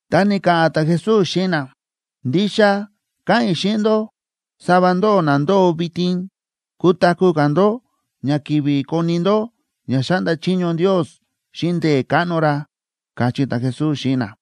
Ta ni̱ka̱ꞌa̱n ta̱Jesús xíꞌin na: ―Ndixa káꞌa̱n i̱ xíꞌin ndó, sava ndóꞌó na ndóo vitin, kutaku̱ ka̱ ndó ña kivi koni ndó ña xáꞌnda chiño Ndios xíꞌin ndee̱ káꞌno ra ―káchí ta̱Jesús xíꞌin na.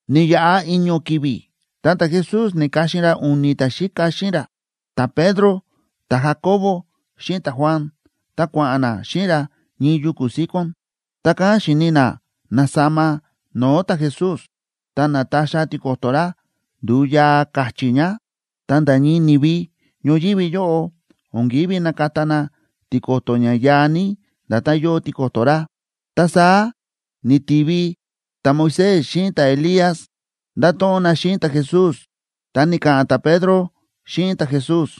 Ni̱yaꞌa i̱ño̱ ki̱vi̱ ta ta̱Jesús na̱ka̱xin ra u̱ni̱ ta̱xíka xíꞌin ra, ta̱Pedro, ta̱Jacobo xíꞌin ta̱Juan, ta kua̱ꞌa̱n na xíꞌin ra ñii yuku̱ síkón. Ta kán xi̱ni na na̱sama no̱o̱ ta̱Jesús. Ta na̱taxa tiko̱to̱ ra, ndu̱u yaa ka̱chi̱ ña, ta nda̱ ñii ni̱vi ñoyívi yóꞌo o̱n kívi nakata na tiko̱to̱ ña yaa ní nda̱tán yóo tiko̱to̱ ra. Ta saá ni̱tivi ta̱Moisés xíꞌin ta̱Elías, ndáto̱ꞌon na xíꞌin ta̱Jesús. Ta ni̱ka̱ꞌa̱n ta̱Pedro xíꞌin ta̱Jesús: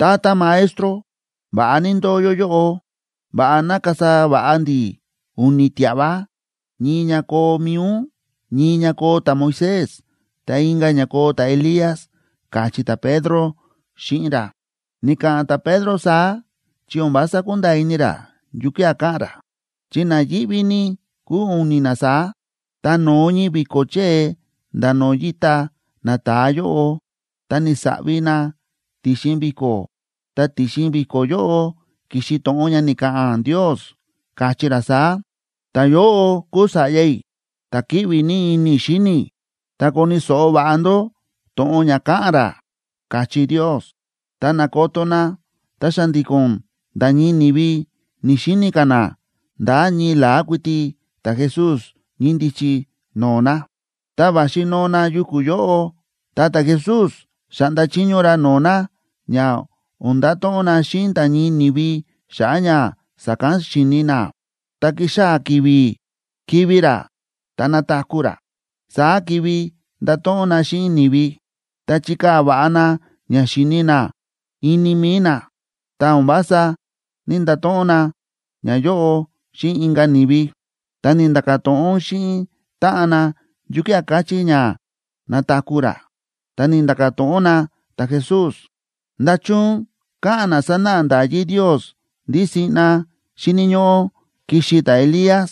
―Tata Maestro, va̱ꞌa ní ndóo yó yóꞌo. Va̱ꞌa ná kasa va̱ꞌa ndi̱ u̱ni̱ tia̱ꞌva, ñii ña koo mi̱i ún, ñii ña koo ta̱Moisés, ta inka̱ ña koo ta̱Elías ―káchí ta̱Pedro xíꞌin ra. Ni̱ka̱ꞌa̱n ta̱Pedro saá chi o̱n vása ku̱nda̱a̱ ini ra yukía̱ ka̱ꞌa̱n ra, chi na yíꞌví ní kúu u̱ni̱ na saá. Ta no̱o ñii vi̱ko̱ chée nda̱ no̱o̱ yíta nata̱a yóꞌo, ta ni̱saꞌvi na ti̱xin vi̱ko̱, ta ti̱xin vi̱ko̱ yóꞌo ki̱xi to̱ꞌon ña ni̱ka̱ꞌa̱n Ndios, káchí ra saá: ―Ta̱yóꞌo kúu Sa̱ꞌya i̱, ta̱ kíꞌvi ní ini i̱ xíni i̱. Ta koni̱ so̱ꞌo va̱ꞌa ndó to̱ꞌon ña ka̱ꞌa̱n ra ―káchí Ndios. Ta na̱koto na, ta xa̱ndi̱ko̱n nda̱ ñii ni̱vi ni̱‑xini ka̱ na, nda̱ ñii la̱á kuiti ta̱Jesús ñíndichi no̱o̱ na. Ta va̱xi noo na yuku̱ yóꞌo, ta ta̱Jesús xa̱ꞌnda chiño ra no̱o̱ na ña o̱n ndato̱ꞌon na xíꞌin nda̱ ñii ni̱vi xa̱ꞌa̱ ña sa̱kán xi̱ni na. Tá kixaa̱ ki̱vi̱ kivi̱ ra ta nataku̱ ra, saá kivi ndato̱ꞌon na xíꞌin ni̱vi. Ta chi̱kaa̱ va̱ꞌa na ña xi̱ni na ini mi̱i na, ta o̱n vása ní‑ndato̱ꞌon na ñayóꞌo xíꞌin inka̱ ni̱vi. Ta ni̱nda̱ka̱ to̱ꞌon xíꞌin táꞌan na yukía̱ káchí ña “nataku̱ ra.” Ta ni̱nda̱ka̱ to̱ꞌon na ta̱Jesús: ―¿Nda̱chun káꞌa̱n na sánáꞌa nda̱yí Ndios ndí siꞌna xíni̱ ñóꞌó kixi ta̱Elías,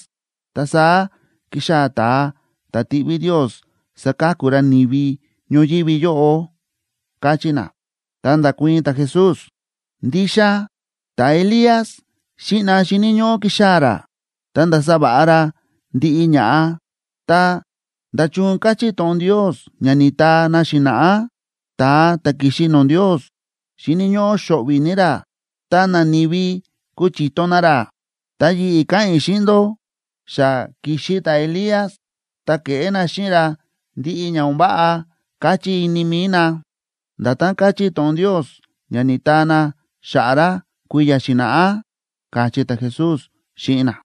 ta saá kixaa̱ ta̱a ta̱ tiꞌví Ndios saka̱ku ra ni̱vi ñoyívi yóꞌo? ―káchí na. Ta nda̱kuii̱n ta̱Jesús: ―Ndixa ta̱Elías siꞌna xíni̱ ñóꞌó kixaa̱ ra, ta ndasa va̱ꞌa ra ndiꞌi ña̱ꞌa. Ta, ¿nda̱chun káchí to̱ꞌon Ndios ña ni̱taa na xi̱na̱ꞌá, ta̱a ta̱ kixi no̱o̱ Ndios xíni̱ ñóꞌó xo̱ꞌvi̱ ní ra ta nani̱vi kuchiton na ra? Ta yi̱ꞌi̱ káꞌa̱n i̱ xíꞌin ndó, xa ki̱xi ta̱Elías, ta ke̱ꞌé na xíꞌin ra ndiꞌi ña o̱n váꞌa káchí ini mi̱i na, nda̱tán káchí to̱ꞌon Ndios ña ni̱taa na xa̱ꞌa̱ ra kui̱ya̱ xi̱na̱ꞌá ―káchí ta̱Jesús xíꞌin na.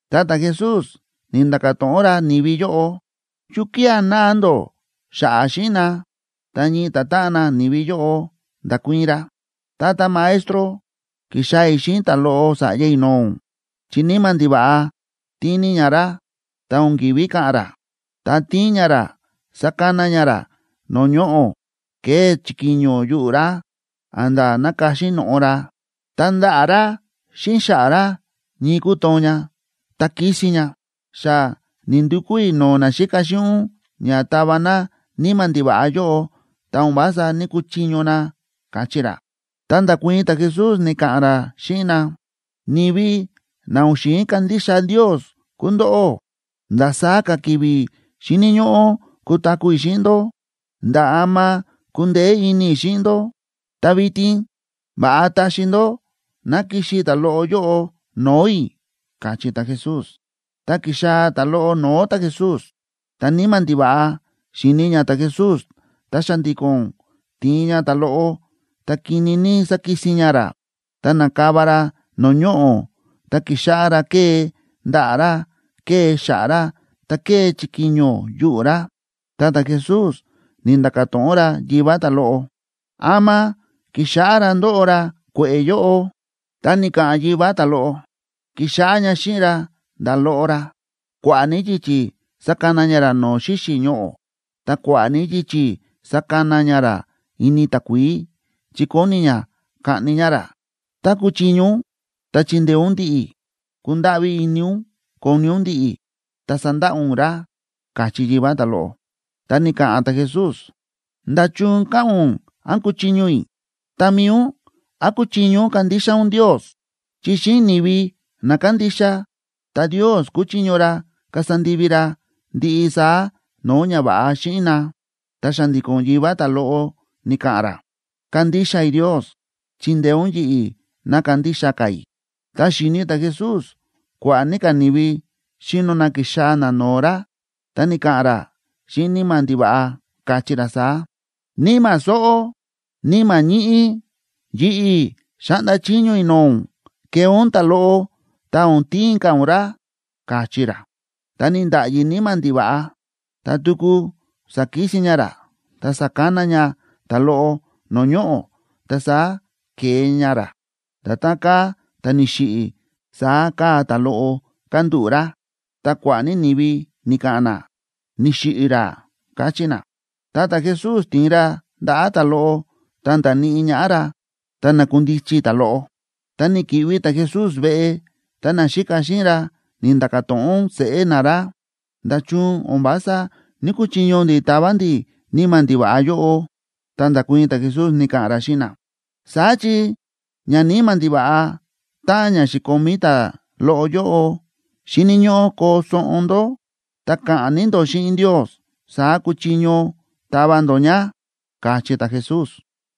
Ta ta̱Jesús ni̱nda̱ka̱ to̱ꞌon ra ni̱vi yóꞌo: ―¿Yukía̱ náa ndó xa̱ꞌa̱ xíꞌin na? Ta ñii ta̱táꞌan nani̱vi yóꞌo nda̱kuii̱n ra: ―Tata Maestro, ki̱xaa̱ i̱ xíꞌin ta̱loꞌo sa̱ꞌya i̱ no̱o̱ ún, chi níma̱ ndiva̱ꞌa tíin ní ña ra ta o̱n ki̱ví ka̱ꞌa̱n ra. Tá tíin ña ra sákana ña ra no̱o̱ ñoꞌo̱, kée chikiño yuꞌu̱ ra, a̱nda̱ nákaxi no̱ꞌo ra, ta ndaꞌa̱ ra xíꞌin xa̱ꞌa̱ ra ñii kútoon ña ta kísin ña. Xa ni̱ndukú i̱ no̱o̱ naxíka xíꞌin ún ña tava na níma̱ ndiva̱ꞌa yóꞌo, ta o̱n vása ní‑kuchiño na ―káchí ra. Ta nda̱kuii̱n ta̱Jesús, ni̱ka̱ꞌa̱n ra xíꞌin na: ―¡Ni̱vi na o̱n xi̱in kandixa Ndios kúu ndóꞌó! ¿Ndasaá ka̱ ki̱vi̱ xíni̱ ñóꞌó kutaku̱ i̱ xíꞌin ndó? ¿Nda̱ ama kundeé ini i̱ xíꞌin ndó? Ta vitin, va̱ꞌa taxi ndó ná kixi ta̱loꞌo yóꞌo no̱o̱ i̱ ―káchí ta̱Jesús. Ta ki̱xaa̱ ta̱loꞌo no̱o̱ ta̱Jesús. Tá níma̱ ndiva̱ꞌa xi̱ni ña ta̱Jesús, ta xa̱ndi̱ko̱n ti̱in ña ta̱loꞌo, ta kini ní sa̱kisin ña ra, ta na̱kava ra no̱o̱ ñoꞌo̱ ta ki̱xáꞌá ra kée ndaꞌa̱ ra, kée xa̱ꞌa̱ ra. Ta kée chikiño yuꞌu̱ ra. Ta ta̱Jesús ni̱nda̱ka̱ to̱ꞌon ra yivá ta̱loꞌo: ―¿Ama ki̱xáꞌá ra ndóꞌo ra kue̱ꞌe̱ yóꞌo? Ta ni̱ka̱ꞌa̱n yivá ta̱loꞌo: ―Ki̱xáꞌá ña xíꞌin ra nda̱ loꞌo ra. Kua̱ꞌa̱ ní yichi̱ sákana ña ra no̱o̱ xíxi̱ ñoꞌo̱, ta kua̱ꞌa̱ ní yichi̱ sákana ña ra ini takuií, chi kóni ña kaꞌni ña ra. Tá kúchiño ún, ta chindeé ún ndi̱ꞌi̱. Kundáꞌví ini ún koni ún ndi̱ꞌi̱, ta sandaꞌa ún ra ―káchí yivá ta̱loꞌo. Ta ni̱ka̱ꞌa̱n ta̱Jesús: ―¿Nda̱chun káꞌa̱n ún, án kúchiño i̱? Ta mi̱i ún, ¿án kúchiño ún kandixa ún Ndios? Chi xíꞌin ni̱vi na kándixa, ta Ndios kúchiño ra kasa ndivi ra ndiꞌi saá no̱o̱ ñava̱ꞌa xíꞌin na. Ta xa̱ndi̱ko̱n yivá ta̱loꞌo ni̱ka̱ꞌa̱n ra: ―Kándixa i̱ Ndios. Chindeé ún yi̱ꞌi̱ ná kandixa ka̱ i̱. Ta xi̱ni ta̱Jesús kua̱ꞌa̱ ní ka̱ ni̱vi xíno na kixaa̱ na no̱o̱ ra, ta ni̱ka̱ꞌa̱n ra xíꞌin níma̱ ndiva̱ꞌa, káchí ra saá: ―Níma̱ sóꞌó, níma̱ ñíꞌí, yi̱ꞌi̱ xáꞌnda chiño i̱ no̱o̱ ún, kee ún ta̱loꞌo ta o̱n tiin ka̱ ún ra ―káchí ra. Ta ni̱nda̱ꞌyi níma̱ ndiva̱ꞌa, ta tuku sa̱kisin ña ra ta sa̱kana ña ta̱loꞌo no̱o̱ ñoꞌo̱, ta saá ke̱e ña ra. Nda̱tán káa ta̱ ni̱xiꞌi̱, saá káa ta̱loꞌo kándúꞌu̱ ra, ta kua̱ꞌa̱ ní ni̱vi ni̱ka̱ꞌa̱n na: ―Ni̱xiꞌi̱ ra ―káchí na. Ta ta̱Jesús ti̱in ra ndaꞌa̱ ta̱loꞌo ta nda̱níꞌi ñaꞌá ra, ta na̱kundichi ta̱loꞌo. Tá ni̱ki̱ꞌvi ta̱Jesús veꞌe, ta naxíka xíꞌin ra ni̱nda̱ka̱ to̱ꞌon seꞌé na ra: ―¿Nda̱chun o̱n vása ní‑kuchiño ndi̱ tava ndi̱ níma̱ ndiva̱ꞌa yóꞌo? Ta nda̱kuii̱n ta̱Jesús, ni̱ka̱ꞌa̱n ra xíꞌin na: ―Saá chi ñaníma̱ ndiva̱ꞌa táꞌan ña xi̱komí ta̱loꞌo yóꞌo, xíni̱ ñóꞌó koo soꞌon ndó ta ka̱ꞌa̱n ní ndó xíꞌin Ndios, saá kuchiño tava ndó ña ―káchí ta̱Jesús.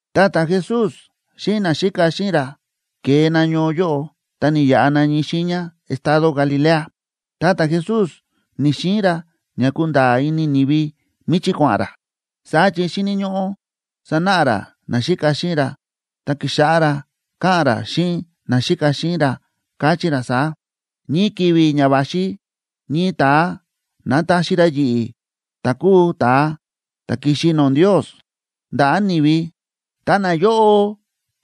Ta ta̱Jesús xíꞌin naxíka xíꞌin ra ke̱e na ñoo yóꞌo ta ni̱yaꞌa na ñii xiiña estado Galilea. Ta ta̱Jesús ni̱‑xiin ra ña kunda̱a̱ ini ni̱vi míchí kua̱ꞌa̱n ra, saá chi xíni̱ ñóꞌó sanáꞌa ra naxíka xíꞌin ra, ta ki̱xáꞌá ra káꞌa̱n ra xíꞌin naxíka xíꞌin ra, káchí ra saá: ―Ñii ki̱vi̱ ña va̱xi ñii ta̱a nataxi ra yi̱ꞌi̱, ta̱ kúu ta̱a ta̱ ki̱xi no̱o̱ Ndios, ndaꞌa̱ ni̱vi. Ta nayóꞌo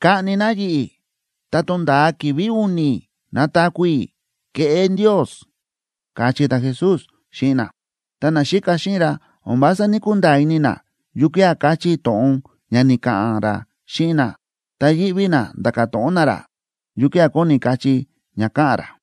kaꞌni na yi̱ꞌi̱, ta tonda̱a ki̱vi̱ u̱ni̱ nataku̱ i̱, keꞌé Ndios ―káchí ta̱Jesús xíꞌin na. Ta naxíka xíꞌin ra o̱n vása ní‑kunda̱a̱ ini na yukía̱ káchí to̱ꞌon ña ni̱ka̱ꞌa̱n ra xíꞌin na, ta yíꞌví na nda̱ka̱ to̱ꞌon na ra yukía̱ kóni kachí ña káꞌa̱n ra.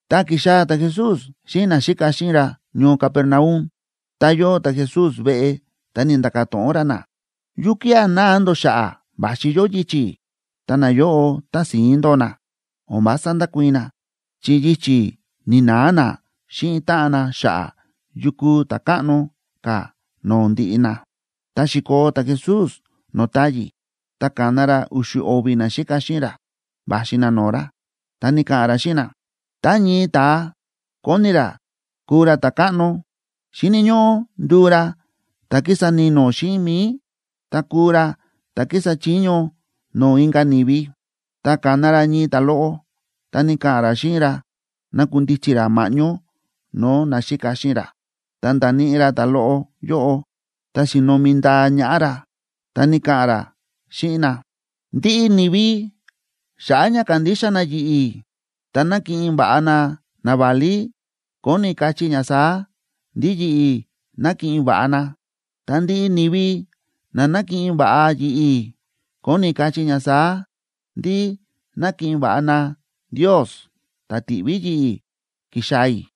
Ta ki̱xaa̱ ta̱Jesús xíꞌin naxíka xíꞌin ra ñoo Capernaum. Ta yóo ta̱Jesús veꞌe, ta ni̱nda̱ka̱ to̱ꞌon ra na: ―¿Yukía̱ náa ndó xa̱ꞌa̱ va̱xi yó yichi̱? Ta nayóꞌo tási̱ín ndóo na, o̱n vása ndákuii̱n na, chi yichi̱ ni̱na̱a na xíꞌin táꞌan na xa̱ꞌa̱ yu kúu ta̱ káꞌno ka̱ no̱o̱ ndiꞌi na. Ta xi̱koo ta̱Jesús no̱o̱ táyi̱, ta ka̱na ra u̱xu̱ o̱vi̱ naxíka xíꞌin ra va̱xi na no̱o̱ ra, ta ni̱ka̱ꞌa̱n ra xíꞌin na: ―Tá ñii ta̱a kóni ra kuu ra ta̱káꞌno, xíni̱ ñóꞌó nduu ra ta̱ kísa ni̱no̱ xíꞌin mi̱i, ta kuu ra ta̱ kísa chiño no̱o̱ inka̱ ni̱vi. Ta ka̱na ra ñii ta̱loꞌo, ta ni̱ka̱ꞌa̱n ra xíꞌin ra nakundichi ra ma̱ꞌñó no̱o̱ naxíka xíꞌin ra. Ta nda̱níꞌi ra ta̱loꞌo yóꞌo ta xi̱nomi ndaa ñaꞌá ra, ta ni̱ka̱ꞌa̱n ra xíꞌin na: ―Ndiꞌi ni̱vi xa̱ꞌa̱ ña kándixa na yi̱ꞌi̱, ta nákiꞌin va̱ꞌa na naválí, kóni kachí ña saá: ndí yi̱ꞌi̱ nákiꞌin va̱ꞌa na. Ta ndiꞌi ni̱vi na nákiꞌin va̱ꞌa yi̱ꞌi̱, kóni kachí ña saá: ndí nákiꞌin va̱ꞌa na Ndios, ta̱ ti̱ꞌví yi̱ꞌi̱ ki̱xaa̱ i̱.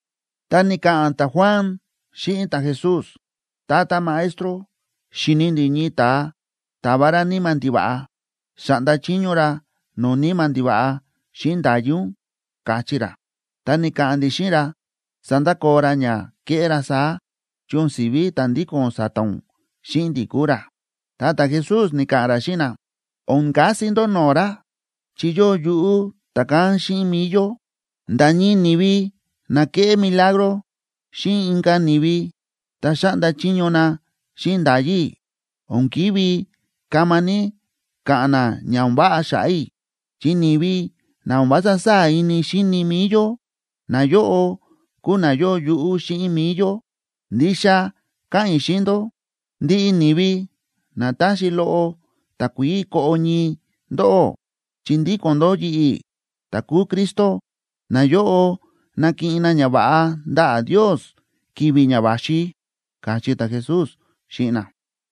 Ta ni̱ka̱ꞌa̱n ta̱Juan xíꞌin ta̱Jesús: ―Tata Maestro, xi̱ni ndi̱ ñii ta̱a táva ra níma̱ ndiva̱ꞌa. Xáꞌnda chiño ra no̱o̱ níma̱ ndiva̱ꞌa xíꞌin nda̱yí ún, káchí ra. Ta ni̱ka̱ꞌa̱n ndi̱ xíꞌin ra sandakoo ra ña kéꞌé ra saá, chi o̱n si̱ví ta̱ ndíko̱n sa̱ta̱ ún xíꞌin ndi̱ kúu ra. Ta ta̱Jesús ni̱ka̱ꞌa̱n ra xíꞌin na: ―O̱n kasi ndó no̱o̱ ra, chi yóo yuꞌú ta̱kán xíꞌin mi̱i yó. Nda̱ ñii ni̱vi na kéꞌé milagro xíꞌin inka̱ ni̱vi ta xáꞌnda chiño na xíꞌin nda̱yí i̱, o̱n ki̱ví kama ní ka̱ꞌa̱n na ña o̱n váꞌa xa̱ꞌa̱ i̱, chi ni̱vi na o̱n vása sáa̱ ini xíni mi̱i yó, nayóꞌo kúu na yóo yuꞌú xíꞌin mi̱i yó. Ndixa káꞌa̱n i̱ xíꞌin ndó, ndiꞌi ni̱vi na táxi loꞌo takuií koꞌo ñii ndóꞌó, chi ndíko̱n ndó yi̱ꞌi̱ ta̱ kúu Cristo, nayóꞌo nakiꞌin na ñava̱ꞌa ndaꞌa̱ Ndios ki̱vi̱ ña va̱xi ―káchí ta̱Jesús xíꞌin na.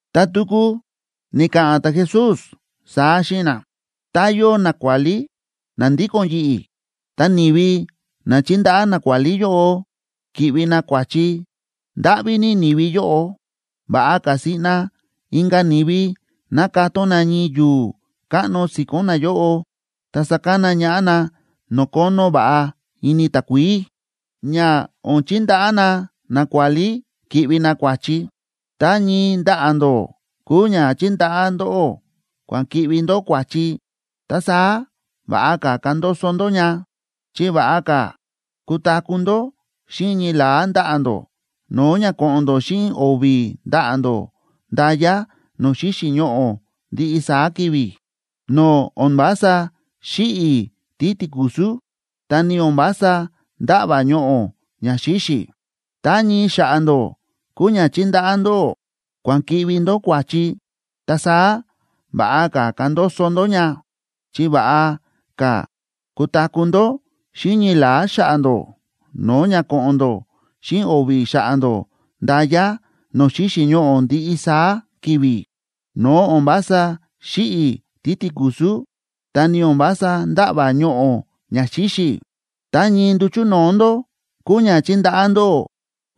Ta tuku ni̱ka̱ꞌa̱n ta̱Jesús saá xíꞌin na: ―Tá yóo nakuálí na ndíko̱n yi̱ꞌi̱, ta ni̱vi na chíndaꞌá nakuálí yóꞌo ki̱ꞌvi na kua̱chi, ¡ndáꞌví ní ni̱vi yóꞌo! Va̱ꞌa ka̱ siꞌna inka̱ ni̱vi ná katón na ñii yu̱u̱ káꞌno si̱ko̱n nayóꞌo, ta sakana ñaꞌá na no̱o̱ kónó va̱ꞌa ini takuií, ña o̱n chindaꞌá na nakuálí ki̱ꞌvi na kua̱chi. Tá ñii ndaꞌa̱ ndó kúu ña chíndaꞌá ndóꞌó kua̱n ki̱ꞌvi ndó kua̱chi, ta saá va̱ꞌa ka̱ kandoso ndó ña. Chi va̱ꞌa ka̱ kutaku̱ ndó xíꞌin ñii la̱á ndaꞌa̱ ndó, no̱o̱ ña ko̱ꞌo̱n ndó xíꞌin o̱vi̱ ndaꞌa̱ ndó nda̱ya no̱o̱ xíxi̱ ñoꞌo̱ ndiꞌi saá ki̱vi̱, no̱o̱ o̱n vása xíꞌi̱ títikusú, ta ni o̱n vása ndáꞌva̱ ñoꞌo̱ ña xíxi̱. Tá ñii xa̱ꞌa̱ ndó kúu ña chíndaꞌá ndóꞌó kua̱n ki̱ꞌvi ndó kua̱chi, ta saá va̱ꞌa ka̱ kandoso ndó ña. Chi va̱ꞌa ka̱ kutaku̱ ndó xíꞌin ñii la̱á xa̱ꞌa̱ ndó, no̱o̱ ña ko̱ꞌo̱n ndó xíꞌin o̱vi̱ xa̱ꞌa̱ ndó nda̱ya no̱o̱ xíxi̱ ñoꞌo̱ ndiꞌi saá ki̱vi̱, no̱o̱ o̱n vása xíꞌi̱ títikusú, ta ni o̱n vása ndáꞌva̱ ñoꞌo̱ ña xíxi̱. Tá ñii nduchu̱ no̱o̱ ndó kúu ña chíndaꞌá ndóꞌó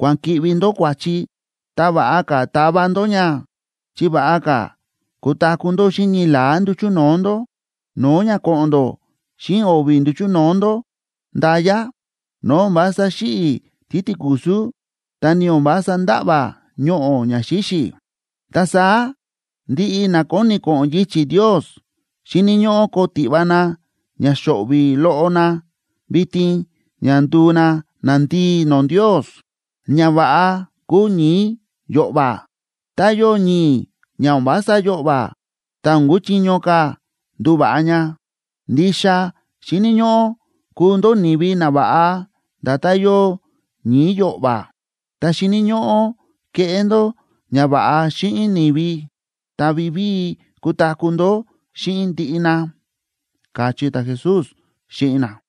kua̱n ki̱ꞌvi ndó kua̱chi, ta va̱ꞌa ka̱ tava ndó ña. Chi va̱ꞌa ka̱ kutaku̱ ndó xíꞌin ñii la̱á nduchu̱ no̱o̱ ndó, no̱o̱ ña ko̱ꞌo̱n ndó xíꞌin o̱vi̱ nduchu̱ no̱o̱ ndó nda̱ya, no̱o̱ o̱n vása xíꞌi̱ títikusú, ta ni o̱n vása ndáꞌva̱ ñoꞌo̱ ña xíxi̱. ’Ta saá ndiꞌi na kóni ko̱ꞌo̱n yichi̱ Ndios xíni̱ ñóꞌó koo tiꞌva na ña xo̱ꞌvi̱ loꞌo na vitin ña nduu na nandii no̱o̱ Ndios. Ña va̱ꞌa kúu ñi̱i̱ yo̱ꞌva̱. Tá yóo ñi̱i̱ ña o̱n vása yo̱ꞌva̱, ta o̱n kúchiño ka̱ nduva̱ꞌa ña. Ndixa xíni̱ ñóꞌó kuu ndó ni̱vi nava̱ꞌa nda̱tán yóo ñi̱i̱ yo̱ꞌva̱, ta xíni̱ ñóꞌó keꞌé ndó ñava̱ꞌa xíꞌin ni̱vi, ta vivíi kutaku̱ ndó xíꞌin ndiꞌi na ―káchí ta̱Jesús xíꞌin na.